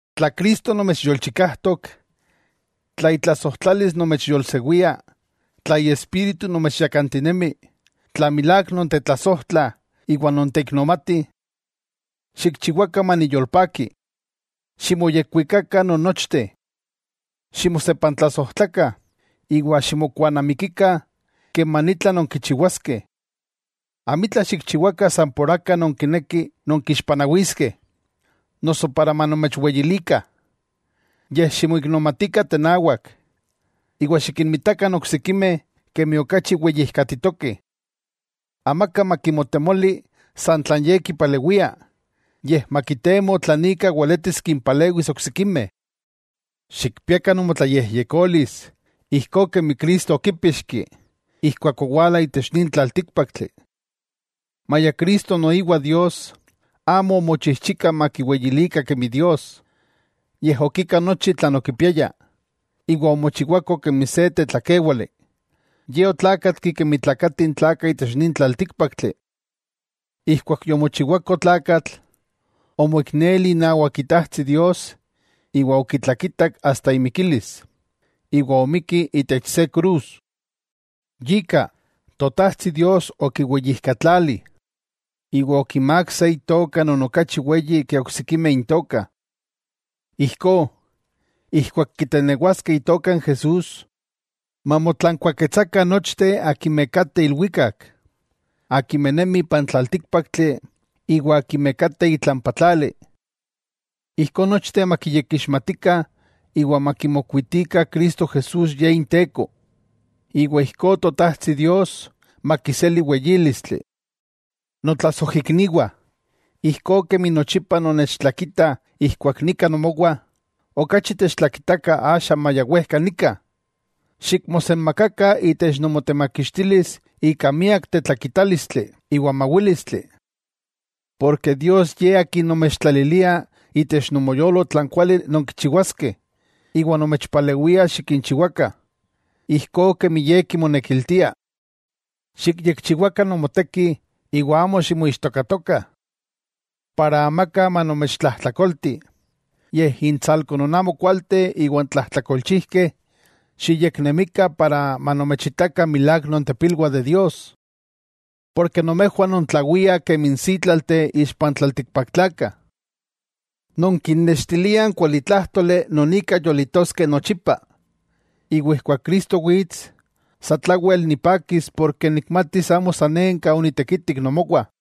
Tla Cristo nomechyolchikajtok, tla itlasojtlalis nomechyolsewia, tla Iespíritu nomechyakantinemi, tla milák nontetlasojtlah iwa nonteiknomatih, xikchiwakah maniyolpaki. Ximoyekwikakah non nochteh. Ximosepantlasojtlakah, iwa ximokuanamikikah keman itla nonkichiwaskeh. Amitla xikchiwakah san por aka nonkinekih nonkixpanawiskeh, noso para manomechweyilikah, yej ximoiknomatikah tenawak, iwa xikinmitakah n oksikimeh kemi okachi weyijkatitokeh. Amaka makimotemoli san tlan ye kipalewia, yej makitemo tlan ika weletis kimpalewis oksikimeh. Xikpiakah nomotlayejyekolis ijkó kemi Cristo okípixki, ijkuak owala itech nin tlaltíkpaktli. Maya Cristo noiwa Dios, amo omochijchika makiweyilikah kemi Dios, yej okika nochi tlan okipiaya, iwa omochiwako kemi se tetlakewáli, Ye otlakatki kemi tlakatih n tlakah itech nin tlaltíkpaktli. Ijkuak yomochiwako tlakatl, omoikneli inawak Itajtsi Dios iwa okitlakitak asta imikilis, iwa omikki itech se krus. Yika, Totajtsi Dios okiweyijkatlali, iwa okimák se Itoka non okachi weyi ke oksikimeh intokah, ijkó, ijkuak kitenewaskeh Itoka n Jesús, mamotlankuaketsakah nochteh akimeh kateh ilwikak, akimeh nemih ipan tlaltíkpaktli, iwa akimeh kateh itlampa tlali. Ijkó nochteh makiyekixmatikah iwa makimokuitikah Cristo Jesús Ye Inteko, iwa ijkó Totajtsi Dios makiseli weyílistli. Notlasojikniwah, ijkó kemi nochipa nonnechtlakitah ijkuak nika nomowah, okachi techtlakitakah axa maya wejka nika. Xikmosenmakakah itech nomotemakixtilis ika miak tetlakitálistli iwa mawílistli. Porke Dios Ye akin nomechtlalilia itech nomoyolo tlan kuali nonkichiwaskeh, iwa nomechpalewia xikinchiwakah, ijkó kemi Ye kimonekiltia. Xikyekchiwakah nomotekih iwa amo ximoixtokatokah, para amaka manomechtlajtlakolti, intsalko n amokualteh iwa n tlajtlakolchijkeh, xiyeknemikah para manomechitakah milák ipilwah Dios. Nomejwah nontlawiah kemi n sítlalteh ixpa n tlaltikpaktlakah. Nonkinnextiliah n kualitlájtoli non ika yolitoskeh nochipa. Iwa ijkuak Cristo wits, satlawel nipakis porke nikmatis amo sanenka onitekitik nomowah.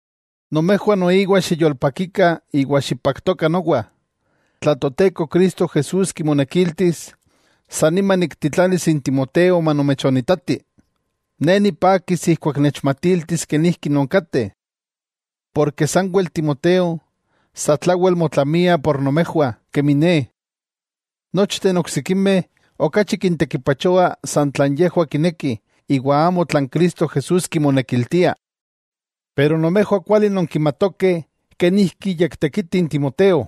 Nomejwah noiwa xiyolpakikah iwa xipaktokah nowa. Tla Toteko Cristo Jesús kimonekiltis, san nima niktitlanis n Timoteo manomechonitati. Ne nipakis ijkuak nechmatiltis kenijki nonkateh. Porke sanwel Timoteo satlawel motlamia por nomejwah kemi ne. Nochteh n oksikimeh okachi kintekipachoa san tlan yejwah kinekih iwa amo tlan Cristo Jesús kimonekiltia. Nomejwah kuali nonkimatokeh kenijki yektekiti n Timoteo,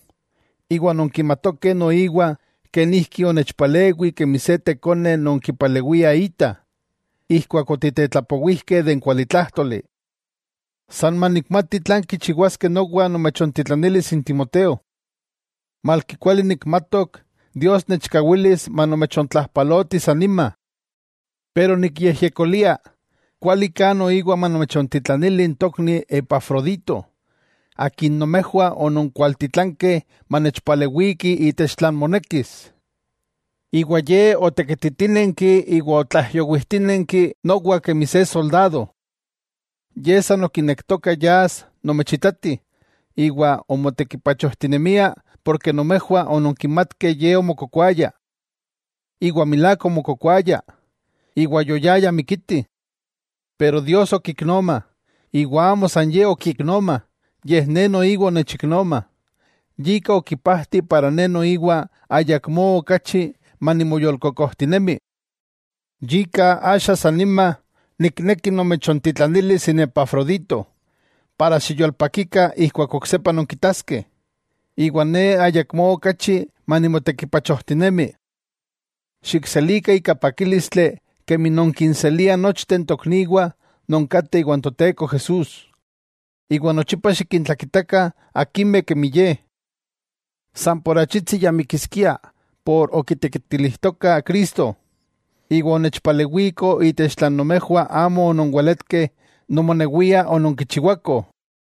iwa nonkimatokeh noiwa kenijki onechpalewi kemi se tekone non kipalewia ita, ijkuak otitetlapowijkeh n kualitlájtoli. San manikmati tlan kichiwaskeh nowa nomechontitlanilis n Timoteo. Malki kuali nikmatok Dios nechkawilis manomechontlajpaloti san nima. Ne nikyejyekolia, kualiká noiwa manomechontitlanili n tokni Epafrodito, akin nomejwah ononkualtitlankeh manechpalewiki itech tlan monekis, iwa ye otekititínenki iwa otlaijyowijtinenki nowa kemi se soldado. Ye san okinektoka yas nomechitati, iwa omotekipachojtinemia ken nomejwah ononkimatkeh ye chikawak omokokoaya. Iwa milák chikawak omokokoaya, iwa ya mikiskia. Pero Dios okiknoma, iwa amo san ye okiiknoma, yej ne noiwa onechiknoma, yika okipajti para ne noiwa ayakmó okachi manimoyolkokojtinemi. Yika axa sannima nikneki nomechontitlanilis n Epafrodito, para xiyolpakikah ijkuak oksepa nonkitaskeh. Iwa ne ayakmó okachi manimotekipachojtinemi. Xikselikah ika pakílistli kemi nonkinseliah nochteh n tokniwah non kateh iwan Toteko Jesús, iwa nochipa xikintlakitakah akimeh nemih kemi ye. San ika achitsi ya mikiskia por okitekitilijtoka Cristo, iwa onechpalewiko itech tlan nomejwah amo ononweletkeh nomonewiah ononkichiwakoh.